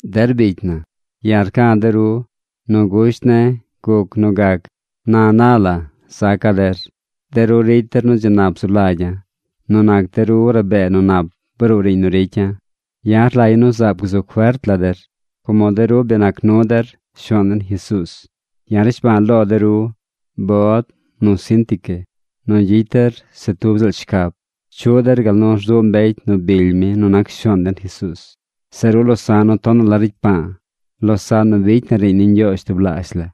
Der bicy na, ya̱ rca̱ de ru. Nu gusht ne̱ guc nu gac na na la zaca̱ der. De ru ricy der nu dzi nap zu lagya̱. Nu nac de ru rabee nu nap bruu riiñ nu ricya̱. Ya̱ rlagya̱ nu zaab gzu fert la der como de ru bi nac nu der Shuaan den Jesuuz. Ya̱ rnishba̱a̱ lo de ru, Bod nu Síntique, nu gyicy der se tub ziꞌl shcab. Chuꞌ der gal nu rzuꞌ mbecy nu bily mi nu nac Shuaan den Jesuuz. Zeꞌ ru losa̱ꞌ nu tonaꞌ la ricy paa, losaꞌn nu bicy na riiñ ni Ñgyoozh tublaazh la,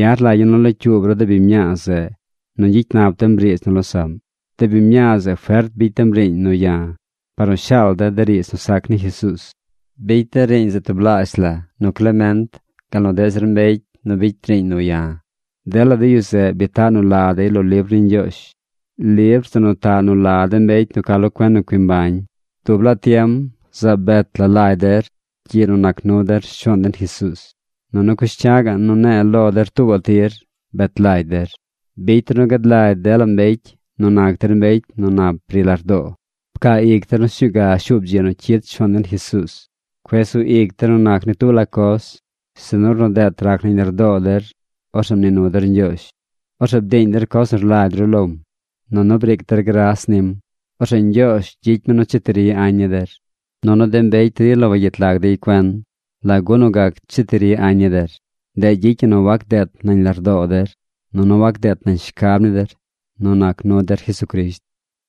ya̱ rlagya̱ nu locyuub ru de biñ mñaa zeꞌ nu gyicy nap dem riidz nu losaꞌm. De biñ mñaa zeꞌ fert bicy dem riiñ nu ya̱ par nu shaal de̱ de riidz nu sac ni Jesuuz. Bicy de̱ riiñ zeꞌ tublaazh la nu Clement gal nu deꞌ zir mbecy nu bicy riiñ nu ya̱. Dela de yu zeꞌ bi taꞌ nu la dey lo libr ni Ñgyoozh, libr zeꞌ nu taꞌ nu la de mbecy nu ca lo cuen nu cui mbañ. Dub laa tiem zaab bet la lagy der gyiꞌ nu nac nu der Shuaan den Jesuuz. Nunu cush cya̱ꞌ ga̱ꞌ nu ne̱e̱ lo der tuubaꞌ tir bet lagy der. Bicy der nu gad lagy dela mbecy nu nac der mbecy nu nap ri lardoo. Pcaa ic der nu sñuu ga shuub dzi nu cyid Shuaan den Jesuuz. Cueꞌ sug ic der nu nac ni tub la coz, sinu ornu deet rac nañ lardoo der, orzeꞌ mnii nu der Ñgyoozh. Orzeꞌ bdiiñ der coz nu rlagy ru lom. Nunu briic der gras nim. Orzeꞌ Ñgyoozh gyicy mi nu cheti ri añ ni der. Nunu de mbecy rila wagyet lag dey cuen lagu nu gac cheti ri añ ni der. Ndeꞌ gyicy ñi nu wac deet nañ lardoo der nunu wac deet nañ shcab ni der nu nac nu der Jesucrisht.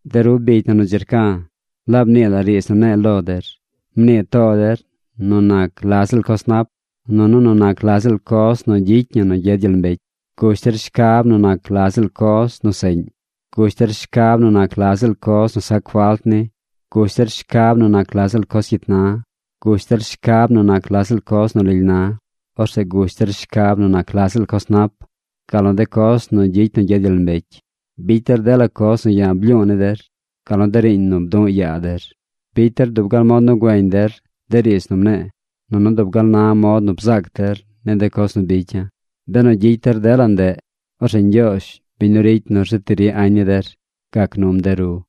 De ru bicy na nu dzi rca̱, laab nii la riidz nu ne̱e̱ lo der. Mnii too der nu nac la ziꞌl coz nap, nunu nu nac la ziꞌl coz nu gyicy ñi nu gyed gyel mbecy. Gush der shcab nu nac la ziꞌl coz nu seꞌñ. Gush der shcab nu nac la ziꞌl coz nu sac falt ni. Gush der shcab nu nac la ziꞌl coz cyit na. Gush der shcab nu nac la ziꞌl coz nu lily na. Orzeꞌ gush der shcab nu nac la ziꞌl coz nap, gal nu de coz nu gyicy nu gyed gyel mbecy. Bicy der dela coz nu ya̱ blyu̱u̱ ni der gal nu de riiñ nu bdu̱ꞌ yaa der. Bicy der dub gal mod nu güeñ der de riidz nu mne̱e̱, nunu dub gal na mod nu bzaac der ni de coz nu bicya̱. Benu gyicy der dela ndeꞌ, orzeꞌ Ñgyoozh, biñ nu ricy nu rzeti ri añ ni der, gac num de ru.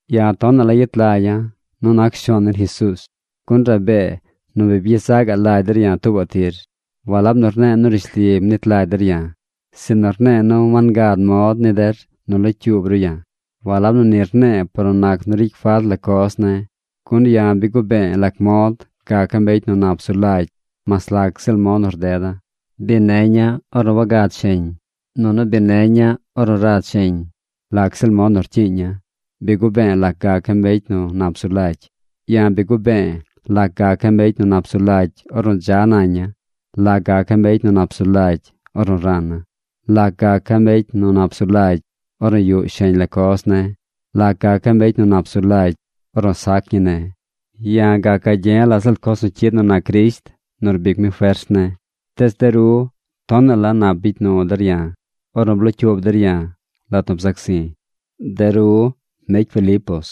Ya̱ tonaꞌ la yet lagya̱ nu nac Shuaan den Jesuuz, gun rabee nu bi byezaꞌ gaꞌ lagy der ya̱ tuubaꞌ tir. Walab nu rne̱e̱ nu rishli mnit lagy der ya̱, sinu rne̱e̱ nu wangad mod ni der nu locyuub ru ya̱. Walab nu ni rne̱e̱ par nu nac nu ricy falt la coz ne̱, gun ya̱ bi gube̱e̱ lac mod gaca̱ mbecy nu nap zu lagy mas lac ziꞌl mod nu rdeda̱. Bi neña̱ ornu wagad sheñ. Nunu bi neña̱ ornu rad sheñ. Lac ziꞌl mod nu rcyiiña̱, bi gube̱e̱ lac gaca̱ mbecy nu nap zu lagy. Ya̱ bi gube̱e̱ lac gaca̱ mbecy nu nap zu lagy ornu dza naña̱, lac gaca̱ mbecy nu nap zu lagy ornu rana̱, lac gaca̱ mbecy nu nap zu lagy ornu yuꞌ sheñ la coz ne̱, lac gaca̱ mbecy nu nap zu lagy ornu sac ñi ne̱. Ya̱ gac gagye̱ la ziꞌl coz nu cyid nu nac Crisht nu rbic mi fers ne̱. Tees de ru tonaꞌ la nap bicy nu der ya̱ ornu blocyuub der ya̱ lat nu bzac zi̱. De ru, mbecy Filipos,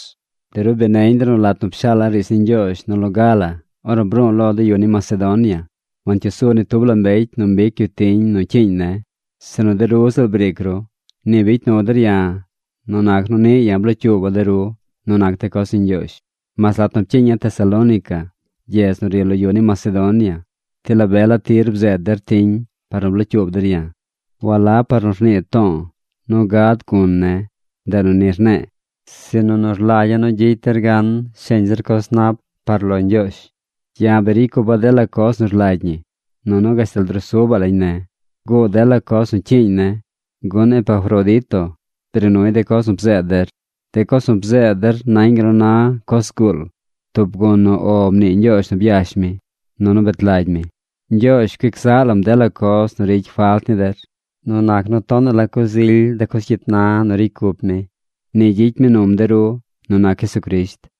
de ru bi neñ der nu lat nu pshaala̱ riidz ni Ñgyoozh nu loga la ornu bru̱u̱ lo de yu ni Macedonia, wancyuu su ni tub mbecy nu mbic yu tiñ nu cyiiñ ne̱, sinu de ru ziꞌl briic ru. Ni bicy nu der ya̱ nu nac nu niꞌ ya̱ blocyuuba̱ de ru nu nac de coz ni Ñgyoozh. Mas lat nu pcyiiña̱ Tesalónica, gyedz nu ri lo yu ni Macedonia, ti la be la tir bzeed der tiñ par nu blocyuub der ya̱. Walab par nu rnii to̱o̱ nu gad gun ne̱, ndeꞌ nu ni rne̱e̱, sinu nu rlagya̱ nu gyicy der gan sheñ zir coz nap par lo Ñgyoozh. Ya̱ bi ricy cupa̱ dela coz nu rlagy ñi, nunu gashtal drusubaꞌ lañ ne̱. Guud dela coz nu cyiiñ ne̱, gun Epafrodito bri nuy de coz nu bzeed der. De coz nu bzeed der nañ gal nu na coz zguul, tub gun nu “O” mnii Ñgyoozh nu byash mi, nunu bet lagy mi. Ñgyoozh cuic zaꞌ lam dela coz nu ricy falt ni der nu nac nu tonaꞌ la coz ily de coz cyit na nu ricy cup mi. Ni gyicy mi num de ru nu nac Jesucrisht.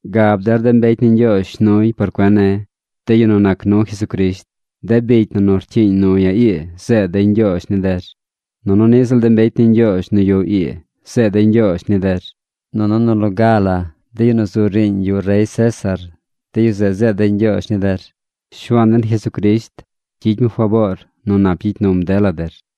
Gab der de mbecy ni Ñgyoozh shnuy por cuen ne̱, de yu nu nac nu Jesucrisht. De bicy na nu rcyiiñ nu ya̱ ii zeed dey ñgyoozh ni der. Nunu niꞌ ziꞌl de mbecy ni Ñgyoozh nu yuꞌ ii zeed dey ñgyoozh ni der. Nunu nu loga la de yu nu zu riiñ yuꞌ rey César, de yu zeꞌ zeed dey ñgyoozh ni der. Shuaan den Jesucrisht gyicy mi faboor nu nap gyicy num dela der.